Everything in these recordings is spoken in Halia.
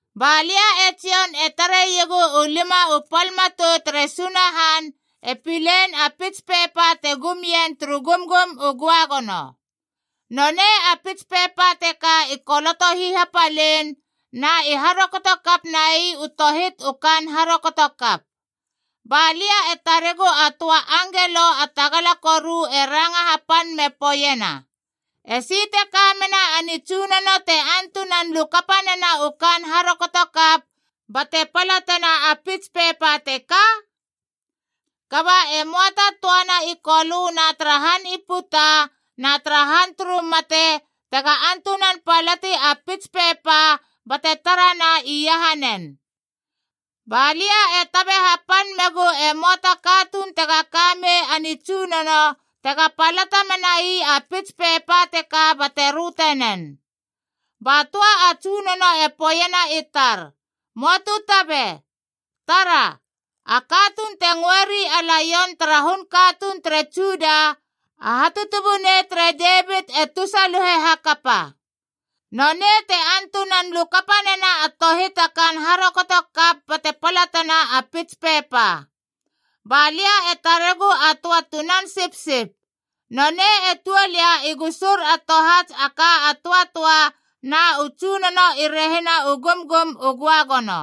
Ba lia e Jon e tareiegu u lima u pal matou tere Sunahan e pilein a pits pepa te gum ien turu gumgum u göagono. Nonei a pits pepa teka i koloto hihapalein, na i harokoto kap nai u tohit u kaan harokotokap. Ba lia e taregu a töa a angelo a tagala koru e ranga hapan me poeiena, “Esi te ka mena a nitsunono te antunan lukapa nena u kaan harokotokap bate palatena a pits pepa teka?” Kaba e möa ta töana i Kolö na tara han i puta na tara han turu mate tega antunan palati a pits pepa bate tarana iahanen. Ba lia e tabe hapan megu e möa ta katuun tega ka mei a nitsunono tega palata menai a pits pepa teka bate röte nen. Ba töa a tsunono e poeiena i tar, “Möa tu tabe. Tara! A katuun te ngöeri a Laion tara hun katuun tere Juda, a Hatutubunei tere Devit e tusaluhe hakapa.a Nonei te antunan lukapa nena a tohit a kaan harokotokap bate palatena a pits pepa!” Ba lia e taregu a töa Tunan Sipsip.b Nonei e tuol ia i gusur a tohats a ka a töatöa na u tsunono i rehina u gumgum u göagono.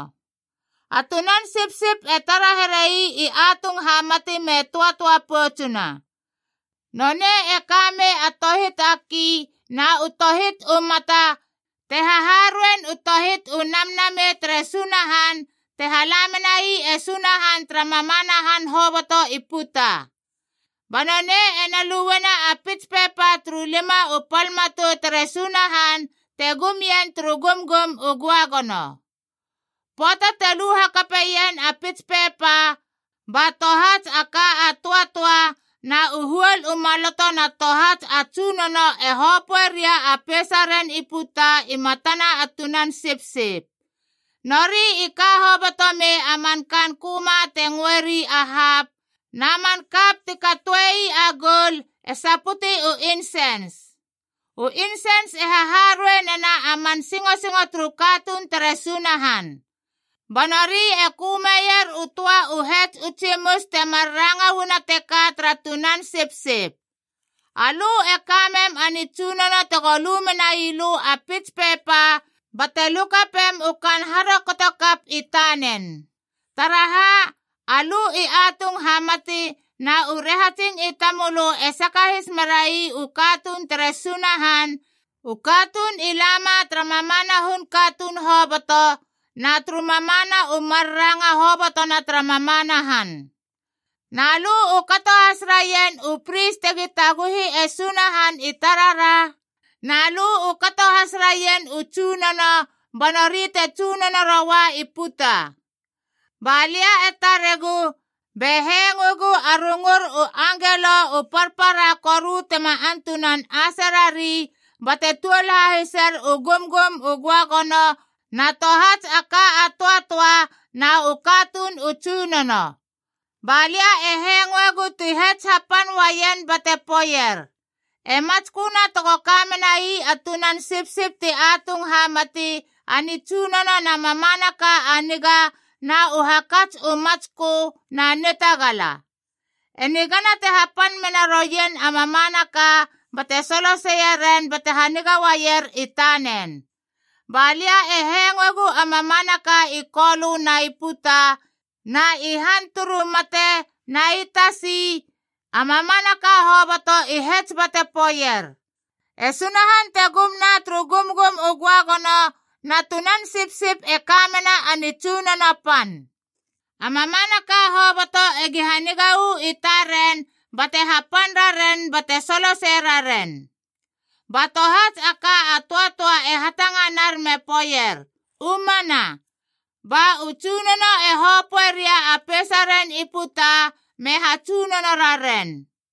A Tunan Sipsip e tara here ii atung hamati me töatöa poutsuna. Nonei e ka mei a tohit a kii na u tohit u mata te haharuein u tohit u namnamei tere Sunahan te hala menai e Sunahan tara mamana han hoboto i puta. Ba nonei ena luena a pits pepa turu lima u pal matou tere Sunahan te gum ien turu gumgum u göagono. Pöata te lu hakapeien a pits pepa, ba tohats a ka a töatöa na u huol u maloto na tohats a tsunono e hopöe ria a peisaren i puta i matana Tunan Sipsip. Nori i ka hoboto mei a man kaan köma te ngöeri a hapc na man kap ti katoe ii a goul e saputi u insens.d U insens e haharuei nena a man singosingo turu katuun tere Sunahan. Ba nori e kömeier u töa u hets u tsimus te mar ranga uana teka tara Tunan Sipsip: “Alö e ka mem a nitsunono tego lu menai lö a pits pepa bate lukapem u kaan harokotokap i tanen. Taraha? Alö i atung hamati na u rahatsing i tamölö e sakahis merai u katuun tere Sunahan, u katuun i lama tara mamana hun katuun hoboto, Na turu mamana u mar ranga hobotona tara mamana han. Na lö u kato has raien u pris tegi taguhi e Sunahan i tarara, na lö u kato has raien u tsunono, ba nori te tsunono roua i puta.” Ba lia e taregu, be hengoegu a rungur u angelo u parpara koru tema antunan ase rari,e bate tuol hahiser u gumgum u göagono na tohats a ka a töatöa na u katuun u tsunono. Ba lia e hengoegu ti hets hapan uaien bate poeier, “E matsköna tego ka menai a Tunan Sipsip ti atung hamati a nitsunono na mamanaka a niga na u hakats u matskö na nitagala. E nigana te hapan mena roien a mamanaka bate soloseie ren bate haniga uaier i tanen!” Ba lia e hengoegu a mamanaka i Kolö na i puta na i han turu mate na i tasi, a mamanaka hoboto i hets bate poeier, “E Sunahan te gumna turu gumgum u göagono na Tunan Sipsip e ka mena a nitsunono pan. A mamanaka hoboto egi haniga uu i taren bate hapan raren bate solosei raren!” Ba tohats a ka a töatöa e hatanganar me poeier, “U mana!” Ba u tsunono e hopöeria a peisaren i puta me hatsunono raren.